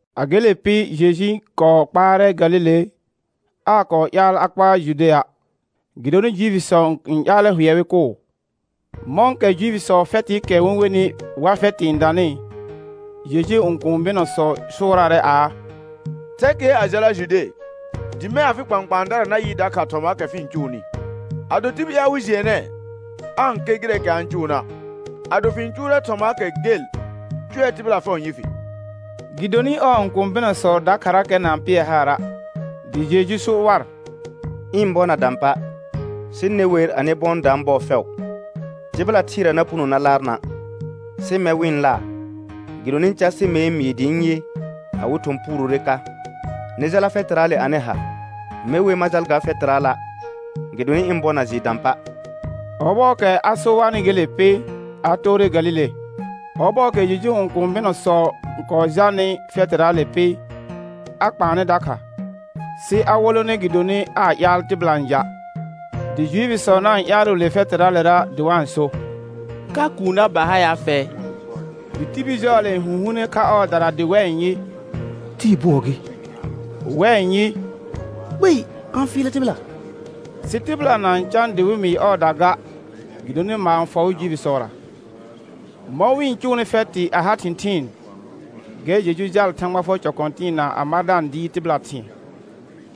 A gele pɩ Jeju n kɔɔ kpaarɛ Galile; aa kɔɔ ƴaal a kpaar Judea', gɩdonɩ Juifisɔ n ƴaalɛ hʋɛ wɩ kʋʋ. Mɔ̃kɛ Juifisɔɔ fɛtɩɩkɛ wɩ-n wenɩ Wa fɛtɩ n danɩ, Jejuu õkũu bɩnɔsɔ sʋʋraarɛ aa: Thɛ kɩɛr a jala Jude, dɩ mɛ̃ afɩ kpãkpãadara na yɩ dakha thɔmaakɛ fɩ-n cʋʋnɩ. Ado tibil ƴaal wɩ jɩɛnɛɛ, aa-n ker gɩrɛɛkɛ a-n cʋʋna'. Ado fɩ-n cʋʋrɛ thɔmaakɛ gel, cʋɛ tɩbɩla fɛʋ n yɩ fɩ. Gɩdonɩ ɔɔ õkũu bɩnɔsɔ dakharakɛ na-n pɩɛ haara'. Dɩ Jeju so war: Ɩ̃ bɔ na dã pa', sɩ ne wer, anɩ bɔ n daan bɔɔ fɛʋ. Tɩbɩla thɩɩra na puno na laar na', sɩ mɛr wɩ-n laar gɩdonɩ easɩ mer n mɩɩ dɩ ɩ̃ yɩ, awɩ thɔ̃ puurore ka. Nɩ jala fɛtɩraale anɩ ha. Me wer ma jal ga fɛtɩraala', gɩdonɩ ɩ̃ bɔ na jɩɩ dã pa'. Ɔbɔɔkɛ a so warnɩ gele pɩ, a toore Galile. Ɔbɔɔkɛ Jejuu õkũu bɩnɔsɔ kɔɔ jalnɩ fɛtɩraale pɩ, a kpaanɛ dakha, sɩ a wolone gɩdonɩ aa ƴaal tɩbɩla n ja'. Dɩ Juifisɔ na-n ƴaalʋʋ le fɛtɩraalera dɩ wa-n so: Ka kuunna ba ha ya fɛ? Dɩ tibil jɔɔle n hũhuune kha ɔɔdara dɩ wɛ n yɩ: Tɩɩ bʋɔ gɩ; wɛ n yɩ: Kpei, a-n fɩɩlɛ tɩbɩla. Sɩ tɩbɩla na-n cã dɩ wɩ mɩɩ ɔɔda ga, gɩdonɩ maar n fɔ wɩ Juifisɔra. Mɔ̃ wɩ-n cʋʋnɩ fɛtɩ a ha thɩ̃thɩɩn, gɛr Jeju jaal Thãgba fʋɔr cɔ kɔ̃tɩɩna a ma da-n dɩɩr tɩbɩla thɩ̃ɛ.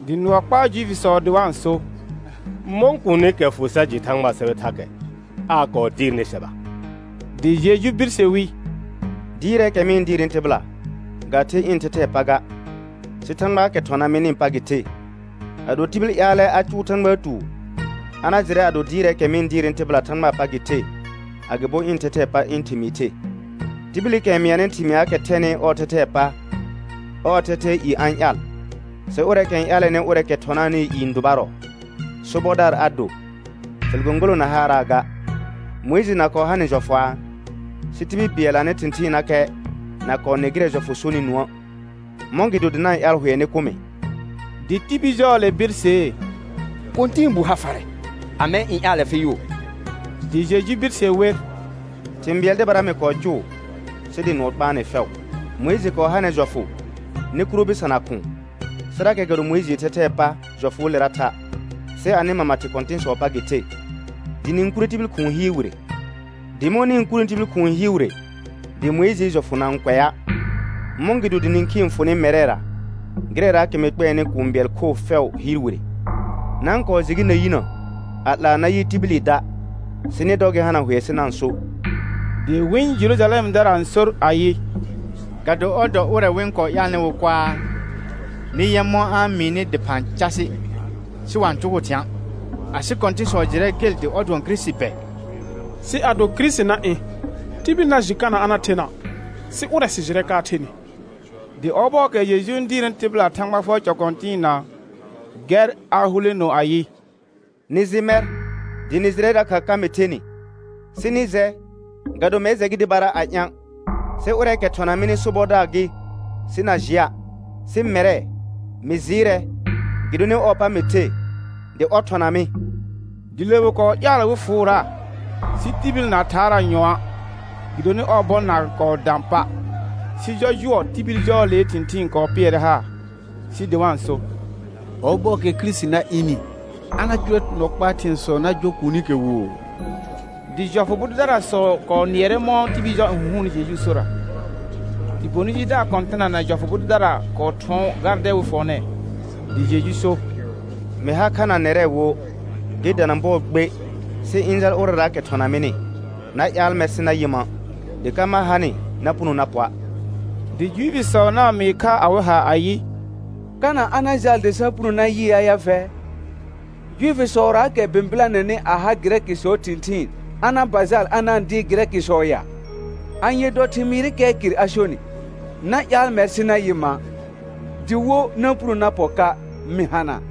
Dɩ nʋɔ kpaa Juifisɔ dɩ wa-n so: Mɔ̃ kuunikɛ fʋ sa jɩ Thãgbaa sɛbɛ thakɛ, aa kɔɔ dɩɩrnɩ sɛba? Dɩ Jeju birse wi: Dɩɩrɛɛkɛ mɩ-n dɩɩrnɩ tɩbɩla ga the ɩ̃ thɛthɛɛ pa ga, sɩ Thãgbaakɛ thɔna mɩnɩɩ pa gɩ the. Ado tibil ƴaalɛ a cʋʋ Thãgbaa tuur, a na jɩrɛ ado dɩɩrɛɛkɛ mɩ-n dɩɩrnɩ tɩbɩla Thãgbaa pa gɩ the, agɩbo ɩ̃ thɛthɛɛ pa ɩ̃ thɩmɩɩ the. Tibilikɛ n mɩanɩ thɩmɩaakɛ thɛnɩ ɔɔ thɛthɛɛ pa, ɔɔ thɛthɛɛ i a-n ƴaal, sɩ ʋrɛɛkɛ n ƴaalɛnɩ ʋrɛɛkɛ thɔnaanɩɩ i n dʋbarɔ, sobɔdaar a do, fɩl gõgolõ na haaraa ga. Mʋɩjɩ na kɔɔ ha nɩ jɔfʋaa? Sɩ tibil bɩɛl anɩ thɩ̃thɩɩnnakɛ na kɔɔ nɩ gɩrɛ jɔfʋ sonɩ nũə'. Mɔ̃gɩdo dɩ na-n ƴaal hʋɛ nɩ kʋ mɩ? Dɩ tibil jɔɔle birsee: Kɔ̃tɛɛbuu ha farɛ. Amɛ n ƴaalɛ fɩ yʋʋ? Dɩ Jeju birse wer: Thɩ̃ bɩɛl dɩbara mɩ kɔɔ cʋʋ sɩ dɩ nʋɔ kpaa nɩ fɛʋ. Mʋɩjɩ kɔɔ ha nɛr jɔfʋ nɩ kuro bɩsana khʋ̃ʋ, sɩrakɛ ga do Mʋɩjɩɩ thɛthɛɛ pa jɔfʋʋlera tha', sɩ anɩ mama thɩ kɔ̃tɩ̃sɔɔ pa gɩ the, dɩ nɩ-n kurre tibil khʋ̃ʋ hɩɩr wire. Dɩ mɔ̃ nɩ-n kurni tibil khʋ̃ʋ hɩɩr wire dɩ Mʋɩjɩɩ jɔfʋ na-n kʋɛa', mɔ̃gɩdo dɩ nĩkhii n fʋ nɩ mɛrɛra gɩrɛraakɛ mɩ kpɛɛnɩ kũu bɩɛl khoo fɛʋ hɩɩr wire? Na-n kɔɔ jɩ gɩ na yinə a 'laa na yɩ tibili da', sɩ nɩ dɔ gɩ hana hʋɛ sɩ na-n so. Dɩ wɩ̃ Jerujalɛmdara n sor ayɩ: Ga do ɔr dɔ ʋrɛ wɩ-n kɔɔ ƴaalnɩna wɩ kʋaa? Nɩ yɛ mɔ̃ a-n mɩɩnɩ dɩphã casɩ, sɩ wa-n cʋgʋʋ thɩ̃a'. Asɩ kɔ̃tɩ̃sɔ jɩrɛ gel dɩ ɔr dʋɔn Kirisiti bɛ? Sɩ ado Kirisiti na ɩ̃, tibil na jɩ kana a na thena', sɩ ʋrɛ sɩ jɩrɛ ka a thenɩ. Dɩ ɔbɔɔkɛ Jeju n dɩɩrnɩ tɩbɩla Thãgba fʋɔr cɔ kɔ̃tɩɩna, gɛr a huleno ayɩ: Nɩ jɩ mɛr, dɩ nɩ jɩrɛ dakha ka mɩ thenɩ. Sɩ nɩ jɛ, ga do mɛr jɛ gɩ dɩbara a ɩ̃a', sɩ ʋrɛɛkɛ thɔna mɩnɩ sobɔdaar gɩ sɩ na jɩa'. Sɩ mɛrɛ, mɩ jɩɩrɛ gɩdonɩ ɔɔ̃ pa mɩ the dɩ ɔr thɔna mɩ. Dɩ le wɩ kɔɔ ƴaal wɩ fʋʋra, sɩ tibil na thaaraa nyɔ̃a', gɩdonɩ ɔɔ bɔ na kɔɔ dã pa'. Sɩ jɔjʋɔ tibil jɔɔlee thɩ̃thɩɩn kɔɔ pɩɛrɛ haar, sɩ dɩ wa-n so: Ɔbɔɔkɛ Kirisiti na ɩnɩ, a na cʋʋrɛ nɔ kpaa thɩ̃ɛsɔ na jɔ kuunikɛ woo? Dɩ jɔfʋ bʋ dʋdarasɔ kɔɔ nɩɛrɛ mɔ̃ tibil jɔ n hũhuunni Jejuu sora. Dɩ bonɩ jidaar kɔ̃tɩna na jɔfʋ bʋ dʋdara kɔɔ thʋɔn gardɛ wɩ fʋɔnɛɛ. Dɩ Jeju so: Mɩ har kha na nɛrɛ wo gɩ dana bɔɔ gbe, sɩ ɩ̃ jal ʋrɛraakɛ thɔna mɩnɩ. Na ƴaal mɛr sɩ na yɩ ma', dɩ ka ma hanɩ na puno na pɔa'. Dɩ Juifisɔ na-n mɩɩ kha awɩ ha ayɩ: Kana a na jal dɩ sa puno na yɩa ya fɛ? Juifisɔraakɛ bɩ̃bɩlanɛnɩ a ha Gɩrɛkɩsɔɔ thɩ̃thɩɩn a na ba jal a na-n dɩɩr Gɩrɛkɩsɔ ya? Anye dɔ thɩmɩɩrɩkɛɛ kɩr a sonɩ: Na ƴaal mɛr sɩ na yɩ ma', dɩ wo, na puno na pɔ ka mɩ hana'.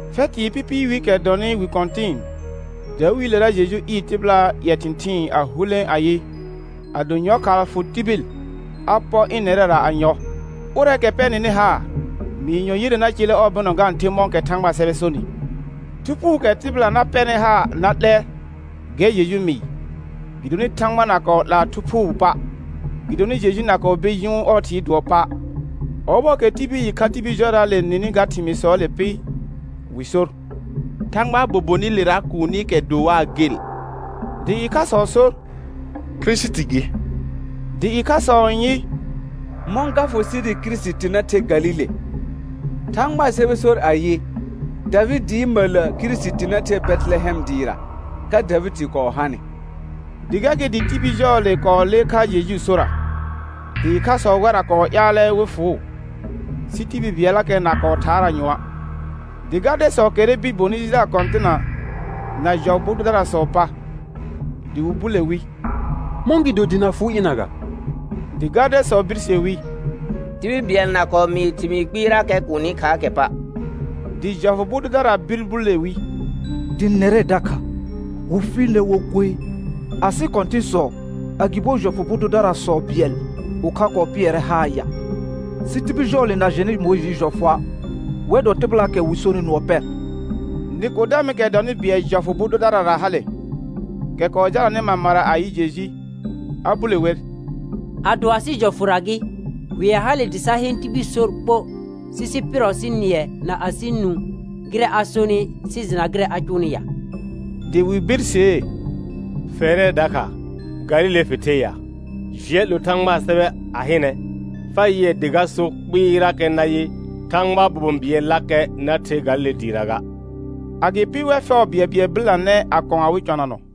Fɛtɩɩ pɩpɩɩ wiikɛ dɔnɩ wi kɔ̃tɩ̃ɩ, dawiilera Jeju ɩɩr tɩbɩlaa ƴɛ thɩ̃thɩɩn a hulẽ ayɩ, ado yɔlkhaa fʋ tibil, a pɔ ɩnɛrɛra a yɔ. Ʋrɛɛkɛ pɛ nɩnɩ haar, mɩɩr yɔ yire na celle ɔɔ bɩnɔ ga-n the mɔ̃kɛ Thãgbaa sɛbɛ sonɩ. Thu Phuukɛ tɩbɩla na pɛrnɩ haar na 'lɛ, gɛr Jeju mɩɩ; gɩdonɩ Thãgba na kɔɔ 'laa Thu Phɩm pa', gɩdonɩ Jeju na kɔɔ bir jʋʋn ɔɔ Thɩɩ dʋɔ pa'. Ɔbɔɔkɛ tibil ɩkha tibil jɔraale nɩnɩ ga thɩmɩɩsɔɔle pɩ, wɩ sor: Thãgbaa bobonɩlera kuunikɛ do waa gel. Dɩ ɩkhasɔ so: Kirisiti gɩ; dɩ ɩkhasɔ n yɩ: Mɔ̃ ga fʋ sɩ dɩ Kirisiti na the Galile? Thãgbaa sɛbɛ sor ayɩ: Davɩdɩɩ məllə Kirisiti na the Bɛtɩlɛhɛm dɩɩra, ka Davɩdɩ kɔɔ hanɩ. Dɩ gɛr gɩ dɩ tibil jɔɔle kɔɔ lee kha Jejuu sora. Dɩ ɩkhasɔ wɛrra kɔɔ ƴaalɛ wɩ fʋʋ, sɩ tibil bɩɛllakɛ na kɔɔ thaaraa nyɔ̃a'. Dɩ gardɛsɔ kɛrrɛ bir bonɩ jidaar kɔ̃tɩna na jɔfʋ bʋ dʋdarasɔɔ pa, dɩ wɩ bule wi: Mɔ̃gɩdo dɩ na fʋʋ ɩna ga? Dɩ gardɛsɔ birse wi: Tibil bɩɛl na kɔɔ mɩɩ thɩmɩɩr kpɩɩrakɛ kuuni khaakɛ pa'. Dɩ jɔfʋ bʋ dʋdara bir bule wi: Dɩ nɛrɛ dakha, wɩ fɩɩl nɛr wo koe? Asɩ kɔ̃tɩ̃sɔ, agɩbo jɔfʋ bʋ dʋdarasɔ bɩɛl ʋkha kɔɔ pɩɛrɛ haar ya? Sɩ tibil jɔɔle na jɛnɩ Mʋɩjɩɩ jɔfʋa', wɛr dɔ tɩbɩlaakɛ wɩ sonɩ nʋɔ pɛ. Nɩkɔdɛmɩkɛ dɔnɩ bɩɛl jɔfʋ bʋ dʋdarara hale, kɛ kɔɔ jalanɩ mamara a yɩ Jeju, a bule wer: Ado asɩ jɔfʋra gɩ, hʋɛ hale dɩ sa heen tibil sor ɓo, sɩ sɩ pɩɩrɔ sɩ nɩɛ na asɩ nũ gɩrɛ a sonɩ sɩ jɩna gɩrɛ a cʋʋnɩ ya? Dɩ wɩ birsee: Fɛrɛ dakha, Galile fɩ the ya? Jɩɛ 'lo Thãgbaa sɛbɛ a hɩnɛ, fa yɩɛ dɩ ga so kpɩɩrakɛ nayɩ: Thãgbaa bobon bɩɛllakɛ na the Galile dɩɩra ga. [Agɩpɩ wɛr fɛʋ bɩɛlbɩɛl bɩlanɛ a kɔ̃ awɩ cɔnanɔ.